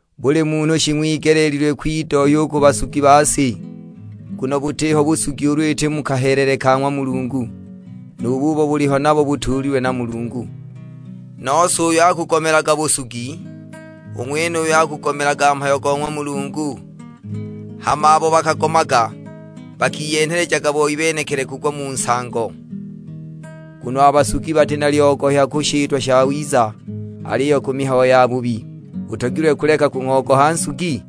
Buli munhu shing'wigeleelilwe kwidohya u ku basugi ba si, nguno butiho busugi ulu iti mu kahelele ka ng'wa Mulungu, nu bubo buliho nabo butuulilwe na Mulungu. Nose uyo akugomelaga busugi, u ng'wenuyo akugugomelaga mhayo go ng'wa Mulungu; hama abo bakagomaga bakiyenhelejaga boi benekili kugwa mu nsango. Nguno a basugi bati na lyogohya ku shitwa shawiza, aliyo ku mihayo yabubi; utogilwe kuleka kung'ogoha nsugi?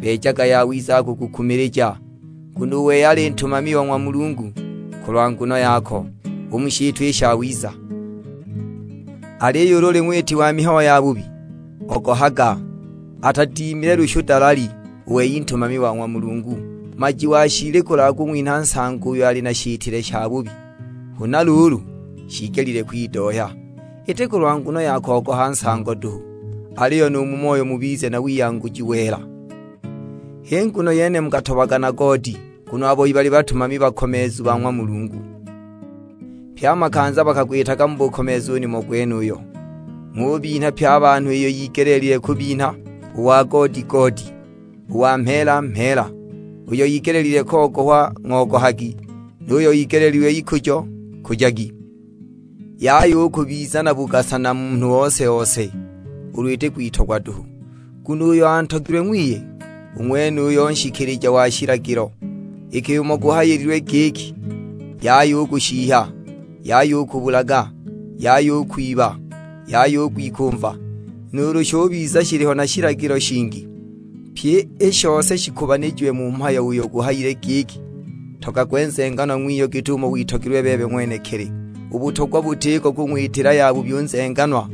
Beejaga yawiza akukukumilija. Nguno u wei ali ntumami o ng'wa Mulungu kulwa nguno yako, u mu shitwa i shawiza. Aliyo ulu uli ng'witi wa mihayo yabubi, ogohaga; atadimile lushu dalali. U wei ntumami wa ng'wa Mulungu, maji wa shiili kulwa kung'winha nsango uyo ali na shitile shabubi. Huna luulu, shiigelile kwidohya; iti kulwa nguno ya kogoha nsango duhu, aliyo nu mu moyo mubize na wiyanguji wela. H'i nguno yene mukatobaga na goodi, nguno a boi bali batumami bakomeezu ba ng'wa Mulungu, pye a makanza bakagwitaga mu bukomeezu u nimo gwenuyo. Ng'ubinha pye a banhu iyo yigelile kubinha; u wa goodi goodi, u wa mheela mheela, uyo igelile kogohwa ng'ogohagi, nu yuyo igeleelilwe ikujo nkujagi. Yaya u kubiza na bugasa na munhu ose-ose, ulu iti kwitogwa duhu; nguno uyo antogilwe ng'wiye, u ng'wenuyo nshikilija wa shilagilo. Iki umo guhayililwe giki, "Yaya u kushihya, Yaya u kubulaga, Yaya u kwiba, Yaya u kwikumva;" nuulu shubiza shiliho na shilagilo shingi, pyi i shose shikubanijiwe mu mhayo uyo guhayile giki, "Ntogagwe nzenganwa ng'wiyo git'umo witogelilwe bebe ng'wenekili." U butogwa butiko kung'witila yabubi u nzenganwa;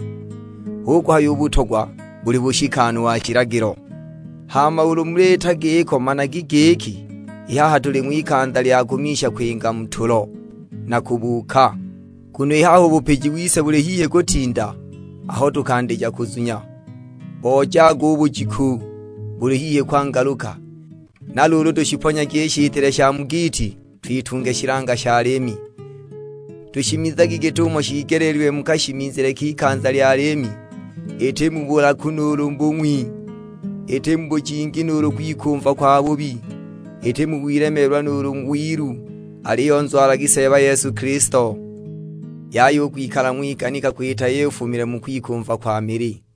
hu kuhaya u butogwa buli bushikanu wa shilagilo. Hama ulu muliita i giko managi giki i haha tuli ng'wikanza lya kumisha kwinga mu tulo, na kubuuka; nguno i haha u bupiji wise buli hihi kutinda aho tukandija kuzunya. Bojaga u bujiku, buli hihi kwangaluka, na luulu tushiponyagi i shitile sha mu giiti twitunge shilanga sha liimi. Tushimizagi git'umo shiigeleelilwe mu kashimizile k'ikanza lya liimi, iti mu bulaku nuulu bung'wi, iti mu bujingi nuulu kwikumva kwabubi, iti mu wilemeelwa nuulu wilu. Aliyo nzwalagi Seeba Yesu Kilisto; yaya u kwikala ng'wiganika kwita iyo ifumile mu kwikumva kwa mili.